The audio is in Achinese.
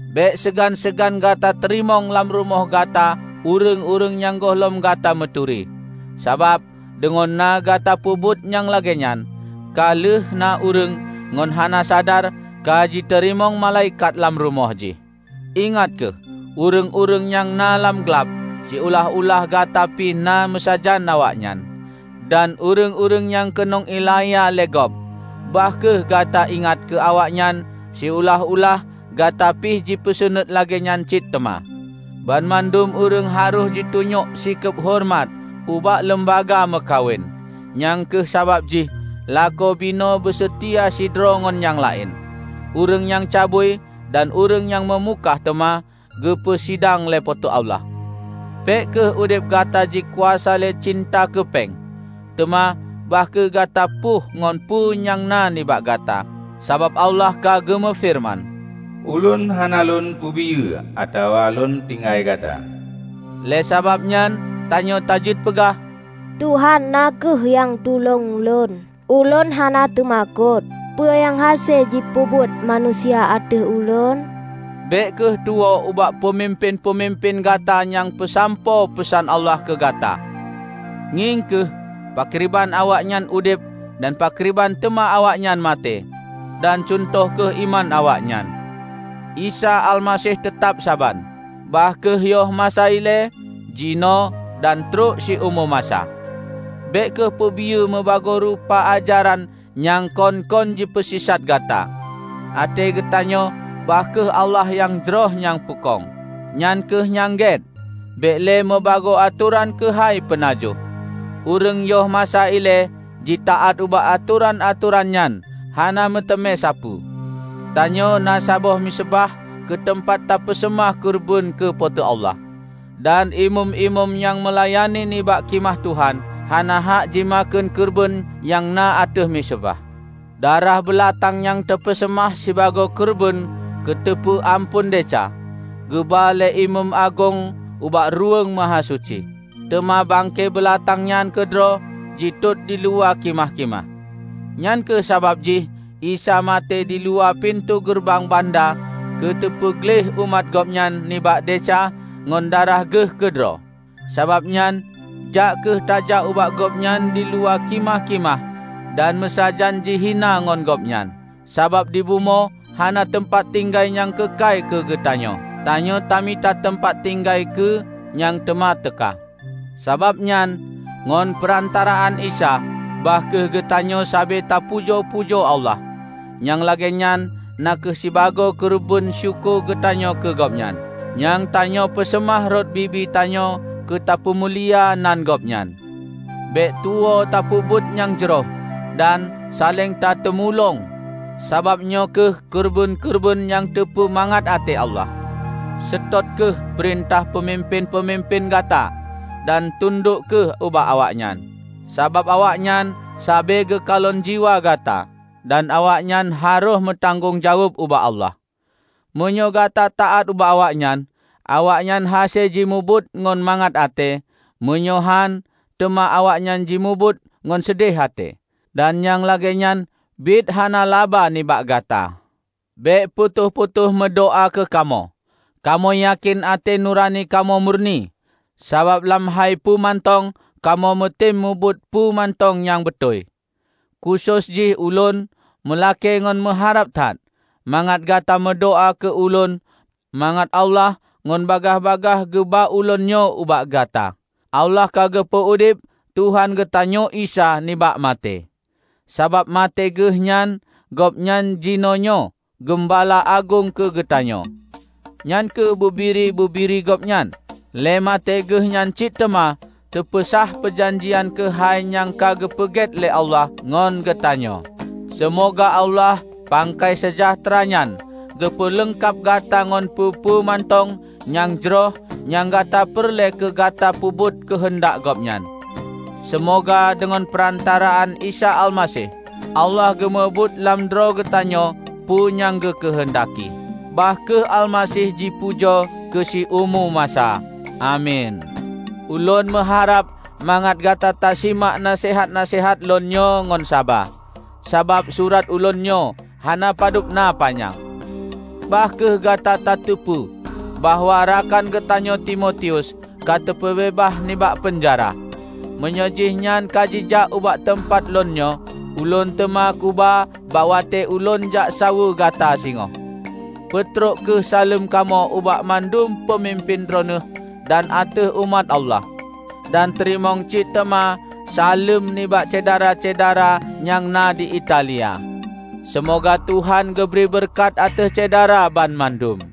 Bék seugan-seugan gata teurimong lam rumoh gata ureuëng-ureuëng nyang gohlom gata meuturi. Sabab, deungon na gata peubuet nyang lagée nyan, ka lheueh na ureuëng, ngon hana sadar, ka jiteurimong malaikat lam rumoh jih. Ingat kheueh ureuëng-ureuëng nyang na lam glab, siulah-ulah gata pi na meusajan awaknyan. Dan ureuëng-ureuëng nyang keunong iélanya lé gob, bah kheueh gata ingat keu awaknyan siulah-ulah gata pih jipeusaneut lagée nyan cit teuma. Banmandum ureuëng harôh jitunyok sikeub horeumat ubak leumbaga meukawen, nyang kheueh sabab jih lakoe binoe beuseutia sidroe ngon nyang laén. Ureuëng nyang cabui dan ureuëng nyang meumukah teuma geupeue sidang lé Po teu Allah. Bék kheueh udeb gata jikuasa lé cinta keu péng, teuma bah kheueh gata pueh ngon peue nyang na nibak gata. Sabab Allah ka geumeufeureuman, "Ulôn hana Lôn peubiyeu atawa Lôn tinggai gata." Lé sabab nyan tanyoe tajeuet peugah, "Tuhan na kheueh nyang tulông lôn, ulôn hana teumakot. Peue nyang hase jipeubuet manusia ateueh ulôn?" Bék kheueh tuwoe ubak peumimpén-peumimpén gata nyang peusampoe peusan Allah keu gata. Ngieng kheueh pakriban awaknyan udeb dan pakriban teuma awaknyan maté, dan cuntoh kheueh iman awaknyan. Isa Almaseh teutab saban, bah kheueh yoh masa ilée, jinoe, dan trok siumu masa. Bék kheueh peubiyeu mubagoe rupa ajaran nyang kon-kon jipeusisat gata. Até geutanyoe bah kheueh Allah nyang jroh nyang peukong, nyan kheueh nyang gét; bék lé mubagoe atoran keuhai peunajoh. Ureuëng yoh masa ilée jitaát ubak atoran-atoran nyan hana meuteumé sapeue. Tanyoe na saboh miseubah keu teumpat tapeuseumah keureubeuen keu Po teu Allah. Dan imeum-imeum nyang meulayani bak Khimah Tuhan, hana hak jimakheun keureubeuen nyang na ateueh miseubah. Darah beulatang nyang teupeuseumah sibagoe keureubeuen keu teupeu amphon desya, geuba lé imeum agong ubak Ruweueng Mahasuci, teuma bangke beulatang nyan keudroe jitot diluwa khimah-khimah. Nyang kheueh sabab jih Isa maté diluwa pintoe geureubang banda keu teupeu gleh umat Gobnyan nibak desya ngon darah Geuh keudroe. Sabab nyan, jak kheueh tajak ubak Gobnyan diluwa khimah-khimah dan meusajan jihina ngon Gobnyan. Sabab dibumoe hana teumpat tinggai nyang keukai keugeutanyoe; tanyoe tamita teumpat tinggai keu nyang teuma teuka. Sabab nyan, ngon peurantaraan Isa, bah kheueh geutanyoe sabe tapujoe-pujoe Allah; nyang lagée nyan na kheueh sibagoe keureubeuen syukoe geutanyoe keu Gobnyan, nyang tanyoe peuseumah rot bibi tanyoe keu tapeumulia nan Gobnyan. Bék tuwoe tapeubuet nyang jroh dan saléng tateumulông, sabab nyoe kheueh keureubeuen-keureubeuen nyang teupeu mangat até Allah. Seutôt kheueh peurintah peumimpén-peumimpén gata, dan tundok kheueh ubak awaknyan. Sabab awaknyan sabe geukalon jiwa gata, dan awaknyan harôh meutanggong jaweueb ubak Allah. Meunyoe gata taát ubak awaknyan, awaknyan hase jimubuet ngon mangat até; meunyoe hán, teuma awaknyan jimubuet ngon seudeh até, dan nyang lagée nyan biet hana laba nibak gata. Bék putôh-putôh meudoá keukamoe. Kamoe yakén até nurani kamoe murni, sabab lam hai peue mantong kamoe meutem mubuet peue mantong nyang beutôi. Khusos jih ulôn meulakée ngon meuharab that, mangat gata meudoá keu ulôn mangat Allah ngon bagaih-bagaih geuba ulôn nyoe ubak gata. Allah ka geupeu udeb Tuhan geutanyoe Isa nibak maté. Sabab maté Geuh nyan Gobnyan jinoenyoe Geumbala Agong keu geutanyoe, nyan kheueh bubiri-bubiri Gobnyan. Lé maté Geuh nyan cit teuma teupeusah peujanjian keukai nyang ka geupeugét lé Allah ngon geutanyoe. Seumoga Allah pangkai seujahteura nyan geupeue leungkab gata ngon peue-peue mantong nyang jroh nyang gata peureulée keu gata peubuet keuheundak Gobnyan. Seumoga, deungon peurantaraan Isa Almaseh, Allah geumubuet lam droe geutanyoe, peue nyang geukeuheundaki. Bah kheueh Almaseh jipujoe keu siumu masa! Amin. Ulôn meuharab mangat gata tasimak naseuhat-naseuhat lôn nyoe ngon saba, sabab surat ulôn nyoe hana padub na panyang. Bah kheueh gata tateupeue bahwa rakan geutanyoe Timotius ka teupeubeubaih nibak peunjara. Meunyoe jih nyan ka jijak ubak teumpat lôn nyoe, ulôn teuma kuba bak watée ulôn jak saweue gata singoh. Peutrok kheueh saleuem kamoe ubak mandum peumimpén droeneueh dan ateueh umat Allah. Dan teurimong cit teuma saleuem nibak syedara-syedara nyang na di Italia. Seumoga Tuhan geubri beureukat ateueh Syedara banmandum.